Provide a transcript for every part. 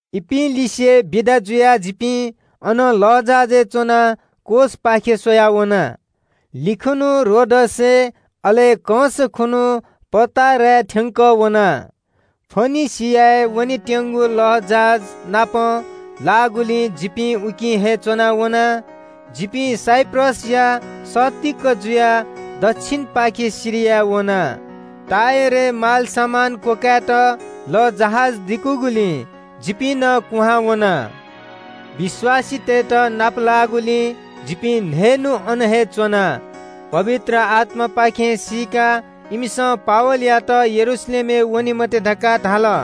इपिं लिसे बिदा जुयाः जिपिं अनं लःजहाजय् च्‍वनाः कोसय् थ्‍यंकः वयाः कन्‍हय् खुन्‍हु रोडसय्, अले कंस खुन्‍हु पटाराय् थ्‍यंकः वना। फोनिकेय् वनेत्‍यंगु लःजहाज नाप लाःगुलिं जिपिं उकी हे च्‍वनाः वना। जिपिं साइप्रसया सत्तीक जुयाः दच्‍छिनपाखें सिरिया वना। टुरोसय् मालसामान क्‍वकाय्‌त लःजहाज दिकूगुलिं जिपिं नं कुहां वना। विश्‍वासीतय्‌त नाप लाःगुलिं जिपिं न्‍हय्‌न्‍हु अन हे च्‍वना। पवित्र आत्‍मापाखें सीकाः इमिसं पावलयात यरूशलेमय् वने मते धकाः धाल।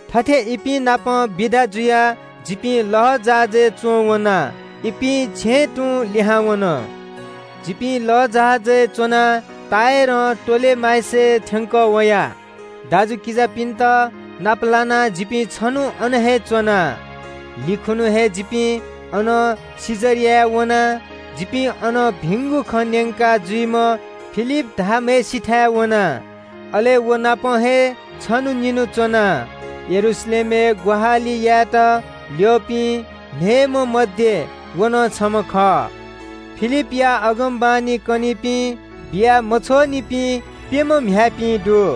थथे इपिं नाप बिदा जुयाः जिपिं लःजहाजय् च्‍वं वना। इपिं छेँय् तुं लिहां वन। जिपिं लःजहाजय् च्‍वनाः टुरोसं टोलेमाइसय् थ्‍यंकः वया। दाजुकिजापिन्‍त नाप लानाः जिपिं छन्‍हु अन हे च्‍वना। कन्‍हय् खुन्‍हु हे जिपिं अनं कैसरियाय् वना। जिपिं अन भिंगु खँ न्‍यंका जुइम्‍ह फिलिप धाःम्‍हय्‌सिथाय् वना। अले व नाप हे छन्‍हु निन्‍हु च्‍वना। यरूशलेमय् ग्‍वाहालि यायेत ल्‍यःपिं न्‍हय्‌म्‍ह मध्‍ये व नं छम्‍ह खः। फिलिपया अगमवाणी कनीपिं, बिया मछ्वःनिपिं प्‍यम्‍ह म्‍ह्याय्‌पिं दु।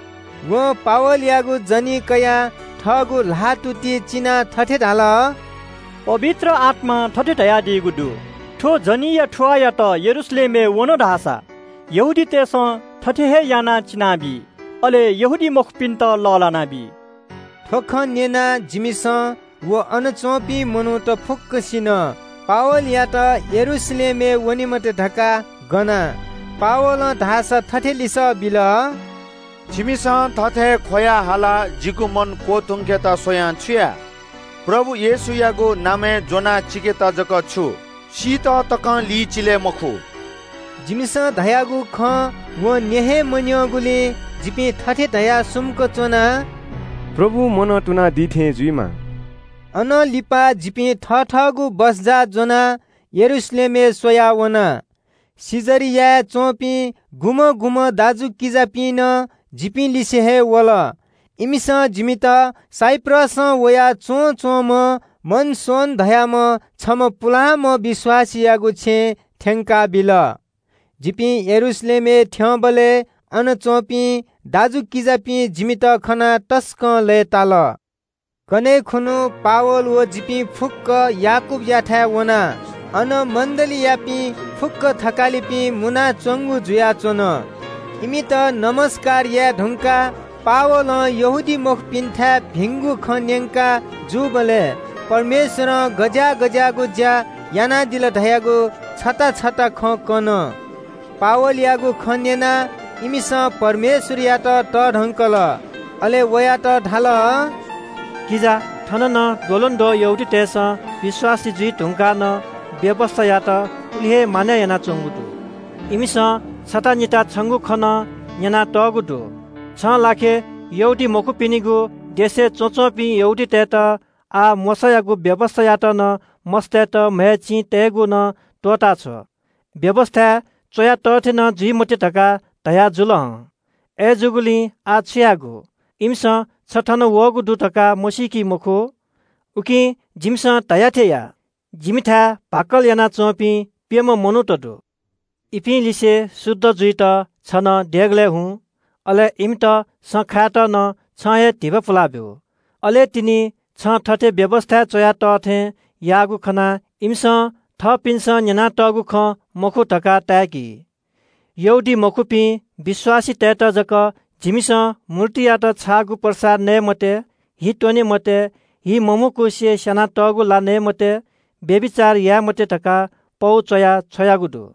वं पावलयागु जनी कयाः थःगु ल्‍हाःतुति चिनाः थथे धाल – “पवित्र आत्‍मां थथे धयादीगु दु – ‘थ्‍व जनीया थुवाःयात यरूशलेमय् वन धाःसा यहूदीतय् नायःतय्‌सं थथे हे यानाः चिनाबी, अले यहूदीमखुपिन्‍त लःल्‍हानाबी।’” थ्‍व खँ न्‍यनाः जिमिसं व अन च्‍वंपिं मनूतय्‌सं पावलयात यरूशलेमय् वने मते धकाः पना। पावलं धाःसा थथे लिसः बिल – “छिकपिन्‍सं थथे ख्‍वयाः हालाः जिगु मन क्‍वतुंकेत स्‍वयां छु याये? प्रभु येशूयागु नामय् ज्‍वनाः चिकेत जक छु सीत तकं लिचिले मखु।” जिमिसं धयागु खँ वं न्‍यँ हे मन्‍यंगुलिं जिपिं थथे धयाः सुम्‍क च्‍वना – “प्रभुं मनं तुनादीथें जुइमा।” अनं लिपा जिपिं थथःगु सामान ज्‍वनाः यरूशलेमय् स्‍वया वना। कैसरियाय् च्‍वंपिं सुं दाजुकिजापिं नं जिपिं लिसे हे वल। इमिसं जिमित साइप्रसं वयाच्‍वंम्‍ह मनासोन धाःम्‍ह छम्‍ह पुलांम्‍ह विश्‍वासीयागु छेँय् थ्‍यंकाबिल। जिपिं यरूशलेमय् थ्‍यंबलय् अन च्‍वंपिं दाजुकिजापिं जिमित खनाः तसकं लय्‌ताल। कन्‍हय् खुन्‍हु पावल व जिपिं फुक्‍क याकूबयाथाय् वना। अन मण्‍डलीयापिं फुक्‍क थकालिपिं मुनाच्‍वंगु जुयाच्‍वन। इमित ज्‍वजलपा याये धुंकाः पावलं यहूदीमखुपिन्‍थाय् भिंगु खँ न्‍यंका जूबलय् परमेश्‍वरं गज्‍याः गज्‍याःगु ज्‍या यानादिल धयागु छता छता खँ कन। पावलयागु खँ न्‍यनाः इमिसं परमेश्‍वरयात तःधंकल। अले वयात धाल – “किजा, थन नं द्वलंद्वः यहूदीतय्‌सं विश्‍वासी जुइ धुंकाः नं व्‍यवस्‍थायात उलि हे मानय् यानाच्‍वंगु दु। इमिसं छता निता छंगु खँ नं न्‍यनातःगु दु। छिं यहूदीमखुपिनिगु देशय् च्‍वनाच्‍वंपिं यहूदीतय्‌त ‘आः मोशायागु व्‍यवस्‍थायात नं मस्‍तय्‌त म्‍हय् चिं तय्‌केगु नं त्‍वःताछ्व, व्‍यवस्‍थाय् च्‍वया तः थें नं जुइ मते’ धकाः धयाजुल हं। अय्‌जूगुलिं आः छु यायेगु? इमिसं छि थन वःगु दु धकाः मसीकी मखु। “उकिं जिमिसं धया थें यानादिसँ। जिमिथाय् भाकल यानाच्‍वंपिं प्‍यम्‍ह मनूत दु। इपिं लिसे शुद्ध जुइत छि नं देगलय् झासँ। अले इमित सँ खायेत नं छिं हे धिबा पुलाबिया दिसँ। अले तिनि छिं थथे व्‍यवस्‍थाय् च्‍वया तः थें याःगु खनाः इमिसं थःपिन्‍सं न्‍यनातःगु खँ मखु धकाः ताय्‌की। “यहूदीमखुपिं विश्‍वासीतय्‌त जक जिमिसं ‘मूर्तियात छाःगु प्रसाद नये मते, हि त्‍वने मते, हि मम्‍हुकुसे स्‍यानातःगु ला नये मते, व्‍यभिचार याये मते’ धकाः पौ च्‍वया छ्वयागु दु।”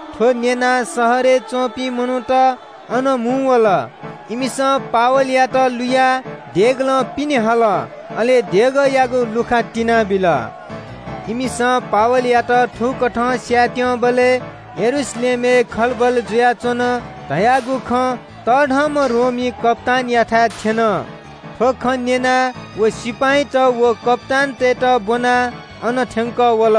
थ्‍व न्‍यनाः शहरय् च्‍वंपिं मनूत अन मुंवल। इमिसं पावलयात लुयाः देगलं पिने हल। अले देगःयागु ध्‍वाखा तिनाबिल। इमिसं पावलयात थुकथं स्‍यायेत्‍यंबलय् यरूशलेमय् खलबल जुयाच्‍वन धयागु खँ तःधंम्‍ह रोमी कप्‍तानयाथाय् थ्‍यन। थ्‍व खँ न्‍यनाः व सिपाइँत व कप्‍तानतय्‌त ब्‍वनाः अन थ्‍यंकः वल।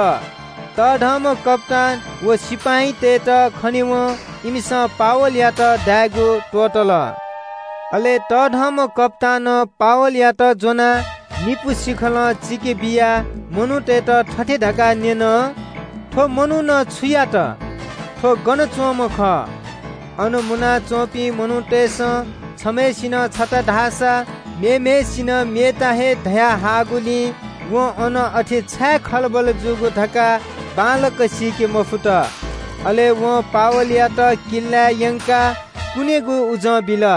तःधंम्‍ह कप्‍तान व सिपाइँतय्‌त खनेवं इमिसं पावलयात दायेगु त्‍वःतल। अले कप्‍तानं पावलयात ज्‍वनाः निपु सिखलं चिकेबियाः मनूतय्‌त थथे धकाः न्‍यन – “थ्‍व मनुखं छु यात? थ्‍व गन च्‍वंम्‍ह खः?” अन मुनाच्‍वंपिं मनूतय्‌सं छम्‍हय्‌सिनं छगू खँ धाःसा मेम्‍हय्‌सिनं मेगु हे खँ धया हाःगुलिं वं अन अथे छाय् खलबल जूगु धकाः बांलाक सीके मफुत। अले वं पावलयात किल्‍लाय् यंकाः कुनेगु उजं बिल।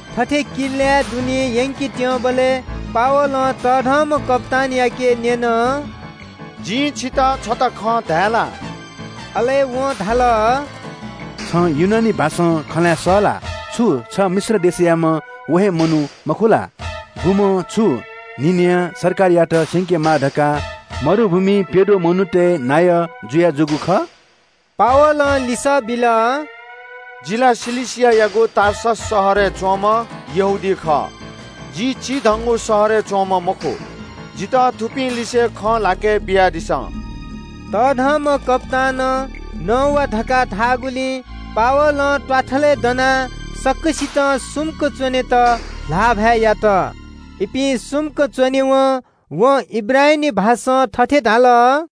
थथे किल्‍लाय् दुने यंकेत्‍यंबलय् पावलं तःधंम्‍ह कप्‍तानयाके न्‍यन – “जिं छितः छता खँ धाये ला?” अले वं धाल – “छं ग्रीक भाषां खँ ल्‍हाये सः ला? छु छ मिश्र देशयाम्‍ह व हे मनू मखु ला? गुम्‍ह छुं न्‍हि न्‍ह्यः सरकारयात स्‍यंकेमाः धकाः मरुभूमिइ प्‍यद्वः मनूतय् नायः जुयाजूगु खः?” पावलं लिसः बिल – “जि ला किलिकियागु टार्सस शहरय् च्‍वंम्‍ह यहूदी खः। जि चिधंगु शहरय् च्‍वंम्‍ह मखु। जितः थुपिंलिसे खँ ल्‍हाके बियादिसँ।” तःधंम्‍ह कप्‍तानं “नवा” धकाः धाःगुलिं पावलं त्‍वाथलय् दनाः सकसितं सुम्‍क च्‍वनेत ल्‍हाःभाय् यात। इपिं सुम्‍क च्‍वनेवं वं हिब्रू भाषां थथे धाल –